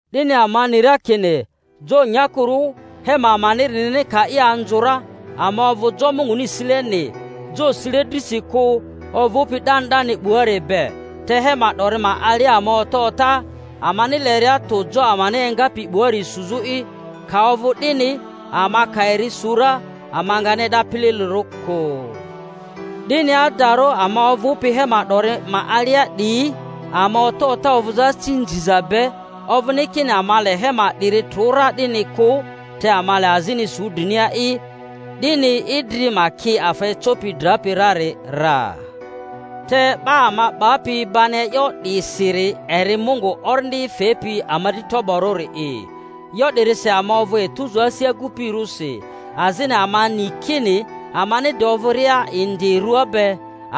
Dini ama ni ra kini jo nyakurᴜ hema amanirini ka i anzᴜ ra, ama ovᴜ jo Munguni sileni, jo sile drisi kᴜ ovᴜpi 'dani 'dani 'buari be. Te hema 'dori ma alia ama ota ota, amani leria tᴜ jo amani engapi 'buari suzᴜ'i; ka ovᴜ 'dini, ama ka eri su ra, ama ngani e'da pililirᴜ kᴜ. 'Dini adarᴜ ama ovᴜpi hema 'dori ma alia 'diyi, ama ota ota ovᴜzᴜ asi nziza be; ovᴜni kini ama le hema 'diri trᴜ ra 'dini kᴜ, te ama le azini su drinia'i, 'dini idri ma ki afa ecopi drapi rari ra. Te 'ba ama 'bapi bani e'yo 'disiri eri Mungu, Orindi fepi ama dri toborᴜri'i. E'yo 'dirisi ama ovᴜ etuzu asi agupirᴜsi; azini ama ni kini amani de ovᴜria indi rua be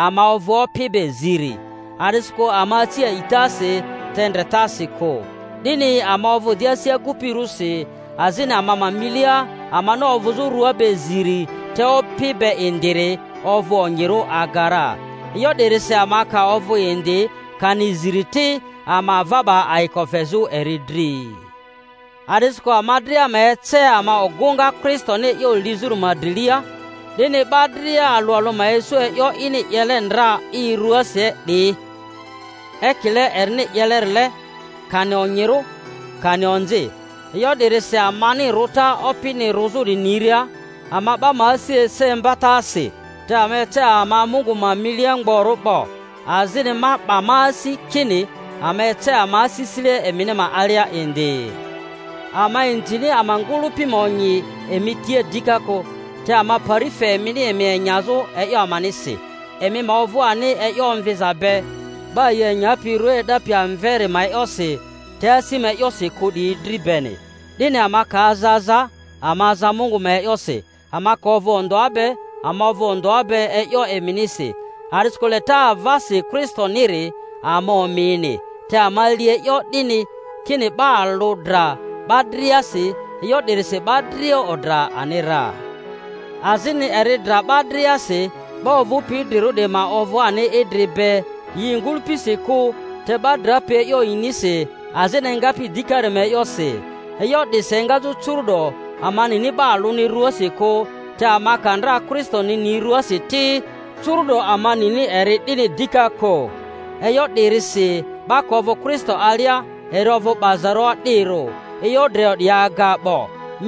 ama ovᴜ Opi be ziri, a'disikᴜ ama aci a'itasi, te ndretasi kᴜ. 'Dini ama ovᴜ di asi agupirᴜsi, azini ama ma milia amani ovᴜzᴜ rᴜa be ziri te Opi be indiri ovᴜ onyirᴜ aga ra. E'yo 'dirisi ama ka ovᴜ indi kani ziri ti, ama ava 'ba ayiko fezᴜ eri dri. A'disikᴜ ama dria ma ece ama ogᴜŋa Kristoni e'yo lizᴜri ma drilia, 'dini 'ba dria alᴜ alᴜ ma isᴜ e'yo ini 'yele ndra i rᴜasi 'diyi, ekile erini 'yelerile, kani onyirᴜ kani onzi. E'yo 'dirisi amani rᴜta Opini rᴜzᴜri niria, ama 'ba ma asi ese imbatasi; te ama ece ama Mungu ma milia mgborᴜ 'bo, azini ma 'ba ma asi kini ama ece ama asisile emini ma alia indi. Ama inzini ama ngᴜlᴜpi ma onyi emi tia dika kᴜ, te ama pari fe emini emi enyazᴜ e'yo amanisi, emi ma ovᴜ ani e'yo omviza be 'ba yi enyapi rᴜa e'dapi amveri ma e'yosi, te asi ma e'yosi kᴜ 'diyi dri beni. 'Dini ama ka aza aza, ama aza Mungu ma e'yosi; ama ka ovᴜ ondᴜa be, ama ovᴜ ondᴜa be e'yo emi-nisi. A'disikᴜ leta avasi Kristo-niri ama omini, te ama li e'yo 'dini, kini 'ba alᴜ dra 'ba driasi, e'yo 'dirisi 'ba dria odra ani ra. Azini eri dra 'ba driasi, 'ba ovᴜpi idrirᴜ 'diyi ma ovᴜ ani idri be yi ngᴜlᴜpisi kᴜ, te 'ba drapi e'yo yinisi azini engapi dikari ma e'yosi. E'yo 'disi engazᴜ curu'do ama nini 'ba alᴜni ruasi kᴜ; te ama ka ndra Kristoni ni ruasi ti, curu'do ama nini eri 'dini dika kᴜ. E'yo 'dirisi 'ba ka ovᴜ Kristo alia eri ovᴜ 'bazarᴜ o'dirᴜ; e'yo drio 'diyi aga 'bo,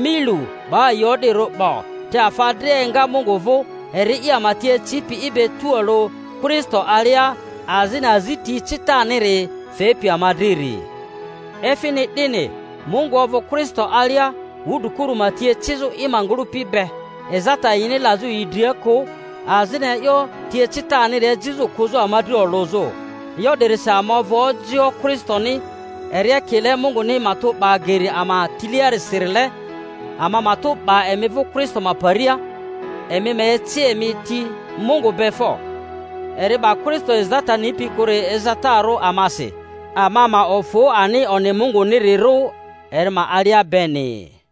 mi lu, 'ba yi o'dirᴜ 'bo. Te afa dria enga Mungu vᴜ, eri'i ama ti ecipi i be tualᴜ Kristo alia, azini azi ti ecitaniri fepi ama driri; efini 'dini, Mungu ovᴜ Kristo alia wudrikuru ma ti ecizᴜ i ma ngᴜlᴜpi be, ezata yini lazᴜ yi dria kᴜ, azini e'yo ti ecitaniri ejizᴜ kᴜzᴜ ama dri olᴜzᴜ. E'yo 'dirisi ama ovᴜ ojioᴜ Kristoni, eri ekile Munguni matᴜ 'ba geri ama tiliasirile. Ama matᴜ 'ba emi vᴜ Kristo ma paria, emi ma eci emi ti Mungu be fo! Eri 'ba Kristo ezata nipi kᴜri ezatarᴜ amasi, ama ma ofᴜ ani onyi Mungunirirᴜ eri ma alia beni.